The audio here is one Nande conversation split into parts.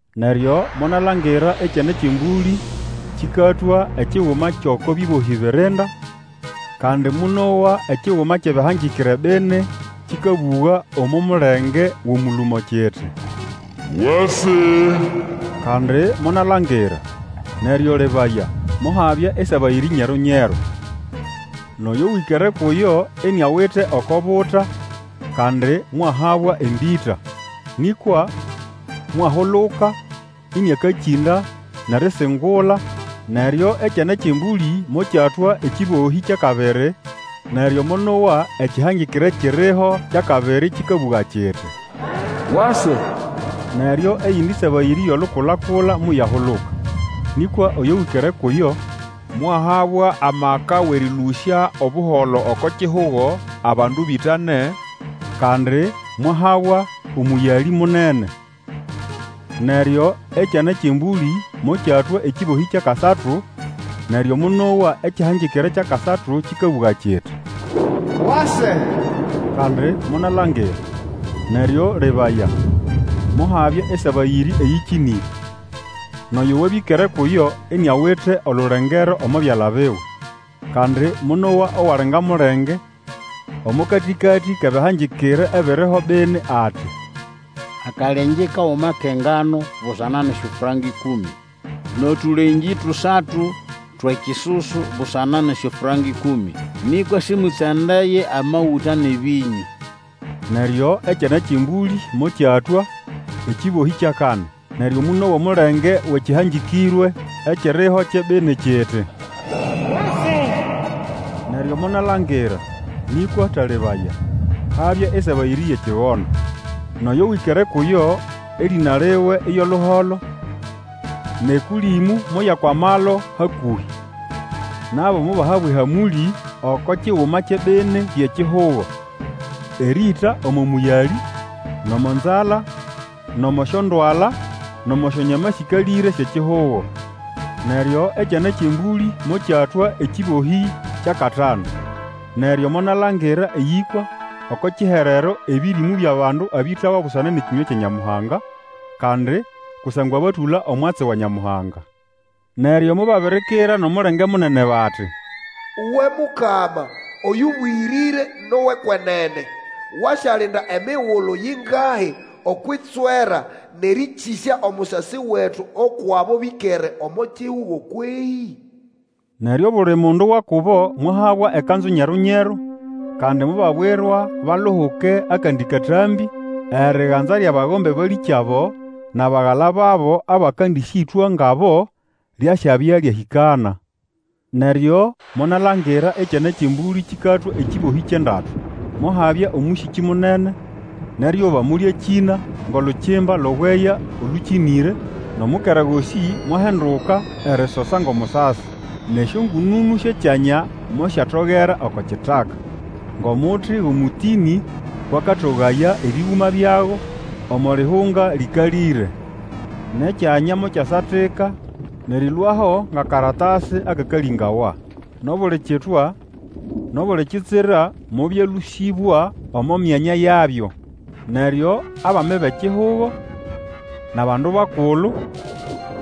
Neryo monalangira Ekyana kyʼEmbũlĩ kĩkatwũa ekiguma kyʼoko bĩbohĩ birinda, kandi monowa ekiguma kyʼebĩhangĩkĩre bini kĩkabũga omo mulenge wʼomũlũmo, kiti, Wase! Kandi monalangira, neryo lebaya, mohabya esabayĩrĩ nyeru-nyeru. Nʼoyo wĩkere kuyo iniawite oko buta, kandi mwahabwa embĩta. Nĩkwa mwahuluka ĩnĩakakĩnda, nʼerisingula, Neryo Ekyana kyʼEmbũlĩ mokyatũa ekĩbohĩ kyʼakabiri, neryo monowa ekĩhangĩkĩre ekiriho kyʼakabiri kĩkabũga kiti, Wase! Neryo eyindi sabayĩrĩ yʼolukulakula moyahuluka. Nĩkwa oyo wĩkere kuyo, mwahabwa amaka wʼerĩlũsya Obuholo oko kihugo, abandu bĩtane, kandi mwahabwa omũyalĩ munene. Neryo Ekyana kyʼEmbũlĩ mokyatũa ekĩbohĩ kyʼakasatu, neryo monowa ekĩhangĩkĩre kyʼakasatu kĩkabũga kiti, Wase! Kandi monalangira, neryo lebaya, mohabya esabayĩrĩ eyĩkĩnĩre. Nʼoyo wĩkere kuyo iniawite olulengero omo byala biwe. Kandi monowa owali nga mulenge omo katĩkatĩ kʼebĩhangĩkĩre ebiriho bini, ati, Akalengĩ kaguma kʼengano busana nʼesyofranka ĩkũmĩ, nʼotũlengĩ tusatu twʼekisusu busana nʼesyofranka ĩkũmĩ. Nĩkwa sĩmũtsandaye amagũta nʼebĩnyũ! Neryo Ekyana kyʼEmbũlĩ mokyatũa ekĩbohĩ kyʼakani, neryo monowa omulenge wʼekĩhangĩkĩrwe ekiriho kyʼebini kiti, Wase! Neryo monalangira, nĩkwa talebaya, habya esabayĩrĩ yʼekigondo. Nʼoyo wĩkere kuyo erĩna liwe iyo Luholo, nʼEkũlĩmũ moyakwamalo hakũhĩ. Nabo mobahabwa ehamũlĩ oko kiguma kyʼebini byʼekihugo, erĩĩta omo mũyalĩ, nʼomo nzala, nʼomo syondwala, nʼomo syonyama sĩkalĩre syʼekihugo. Neryo Ekyana kyʼEmbũlĩ mokyatũa ekĩbohĩ kyʼakatanu. Neryo monalangira eyĩkwa oko kiherero ebĩrĩmũ byʼabandu abĩtawa busana nʼekĩnywa kya Nyamuhanga, kandi kusangwa batũla omwatsi wa Nyamuhanga. Neryo mobabirikira nʼomulenge munene bati, Uwe Mukama, oyũbũyĩrĩre nʼowʼekwenene! Wasyalinda emigulu yingahi okwʼitswera nʼerĩkĩsya omusasi wetu ukwʼabo bĩkere omo kihugo kwehĩ? Neryo obuli mundu wa kubo mwahabwa ekanzu nyeru-nyeru kandi mobabwirwa baluhuke akandi katambĩ, eriganza lyʼabagombe balĩkyabo, nʼabagala babo abakandĩsyĩtwa ngabo, lyasyabya lyahĩkana. Neryo monalangira Ekyana kyʼEmbũlĩ kĩkatũa ekĩbohĩ kyʼendatu. Mohabya omũsĩkĩ munene, nʼeryuba molyakĩna ngʼolukimba lʼobweya olũkĩnĩre, nʼomukera gosĩ mwahinduka erisosa ngʼomusasi. Nʼesyongũnũnũ syʼekyanya mosyatogera oko kitaka, ngʼomuti wʼomũtĩnĩ kwʼakatogaya ebĩgũma byago omo lihunga lĩkalĩre. Nʼekyanya mokyasatika nʼerĩlũaho ngʼakaratasi akakalĩbawa. Nʼobuli kitwa, nʼobuli kitsira mobyalũsĩbwa omo myanya yabyo. Neryo abami bʼekihugo, nʼabandu bakulu,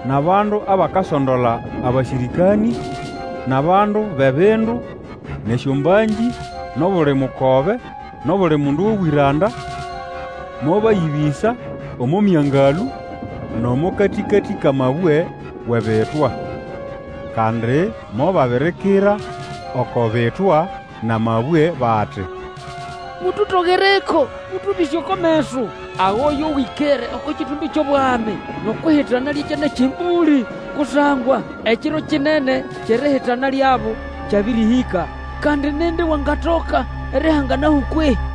nʼabandu abakasondola abasĩrĩkanĩ, nʼabandu bʼebindu, nʼesyombangĩ, nʼobuli mukobe, nʼobuli mundu wʼobwĩranda, mobayĩbĩsa omo myangalũ nʼomo katĩkatĩ kʼamabwe wʼebitwa. Kandi mobabirikira oko bitwa nʼamabwe bati, Mututogereko, mũtũbĩse oko meso agʼoyo wĩkere oko kĩtũmbĩ kyʼobwami, nʼokwʼihitana lyʼEkyana kyʼEmbũlĩ! Kusangwa ekiro kinene kyʼerihitana lyabo kyabĩrĩhĩka, kandi nindi wangatoka erihanganaho kwehĩ?